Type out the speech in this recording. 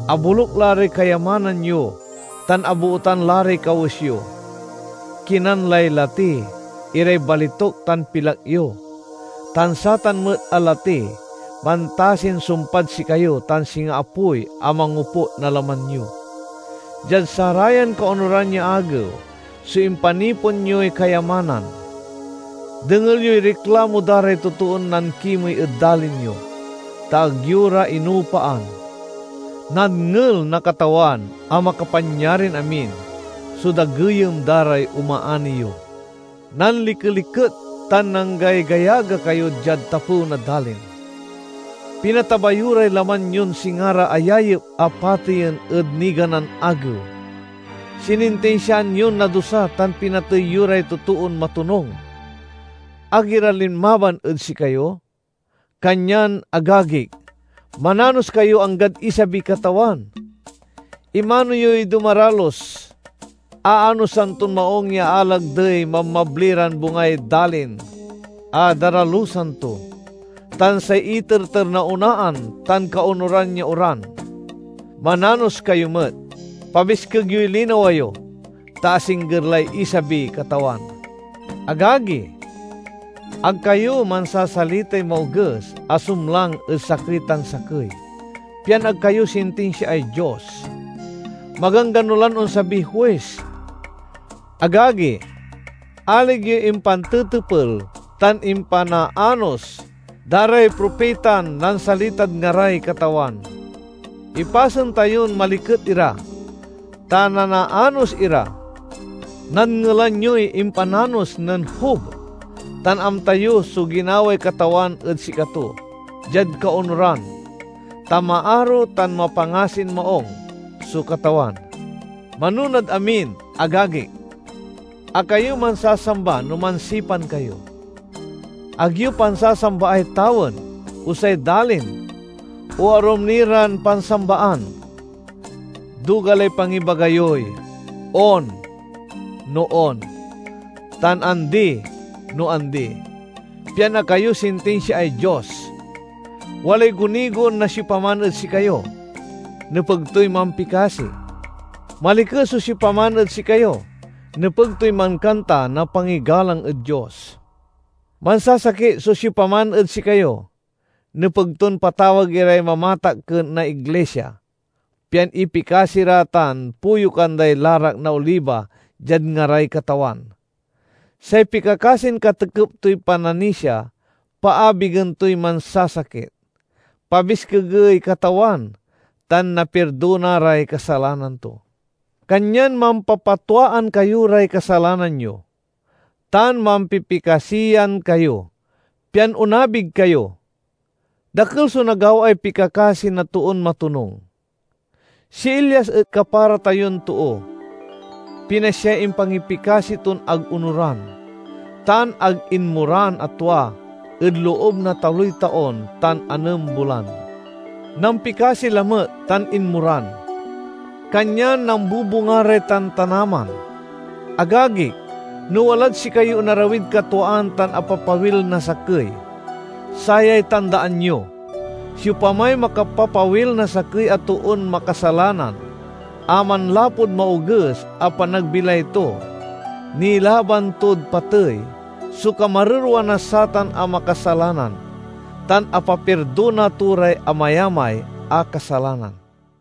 Aboluk la ray kayamanan yo, tan abootan la ray kawes yo. Kinan lay lati iray balituk tan pilak yo, tan satan met a lati mantasin sumpad sikayo tan singa apoy a mangoput na laman yo. Diad sarayan kaonuran ya agew so impanipon yoy kayamanan. Dengel yoy riklamo da ray totoon nankimey ed dalin yo, ta ag yo ra inoopaan. Nadngel na Katawan a Makapanyarin-amin so dageyem da ray omaani yo! Nanlikeliket tan nanggaygayaga kayo diad tapew na dalin. Pinataba yo ray laman yon singa ra ayayep a pateyen ed niganan agew. Sinintinsiaan yon nadusa tan pinatey yo ray totoon matonung; ag ira linmaban ed sikayo. Kanyan, agagik, mananos kayo anggad isabiy Katawan. Imano yoy dumaralus. Aanosan ton maung ya alagdey mabmabli ran bungay dalin a daralusan to, tan say iterter na onaan tan kaonuran ya oran. Mananos kayo met. Pabiskeg yoy linawa yo, ta asingger lay isabiy Katawan. Agagi, ag kayo mansasalitay maoges a sumlang ed sakey tan sakey, pian ag kayo sintinsiaay Dios. Maganggano lan onsabiy Huis! Agagi, alig yoy impantetepel tan impanaanos da ray propitan nansalitad ngaray Katawan. Ipasen tayon maliket ira, ta nanaanos ira. Nadngelan yoy impananos nen Job tan amta yo so ginaway Katawan ed sikato diad kaonuran, ta maaro tan mapangasin maung so Katawan. Manonad amin, agagik, ag kayo mansasamba no mansipan kayo. Ag yo pansasambaay tawen, o say dalin, o arum ni ran pansambaan. Duga lay pangibaga yoy "On" no on, tan "Andi" no andi, pian ag kayo sintinsiaay Dios. Walay gunigon na siopaman ed sikayo? Nepeg toy mampikasi. Maliket so siopaman ed sikayo? Nepeg toy mankanta na pangigalang ed Dios. Mansasakit so siopaman ed sikayo? Nepeg ton patawag iray mamatakken na iglisia, pian ipikasi ra tan poyukan day larak na oliba diad ngaray Katawan. Say pikakasin katekep toy pananisia paabigen toy mansasakit, pabiskegey Katawan, tan napirdona ray kasalanan to. Kanyan mampapatwaan kayo ray kasalanan yo, tan mampipikasiyan kayo, pian onabig kayo. Dakel so nagawaay pikakasi na toon matonung. Si Elias et kapara tayon too. Pinasyay impangipikasi ton ag onoran, tan ag inmoran a tua ed loob na taloy taon tan anem bulan. Nampikasi lamet tan inmoran, kanyan nambubunga ray tantanaman. Agagik, no walad sikayoy onarawid katwaan tan apapawil na sakey, sayay tandaan yo: siopamay makapapawil na sakey a toon makasalanan a manlapud maoges a panagbilay to, nilaban tod patey so kamarerwa na satan a makasalanan, tan apapirdona to ray amayamay a kasalanan.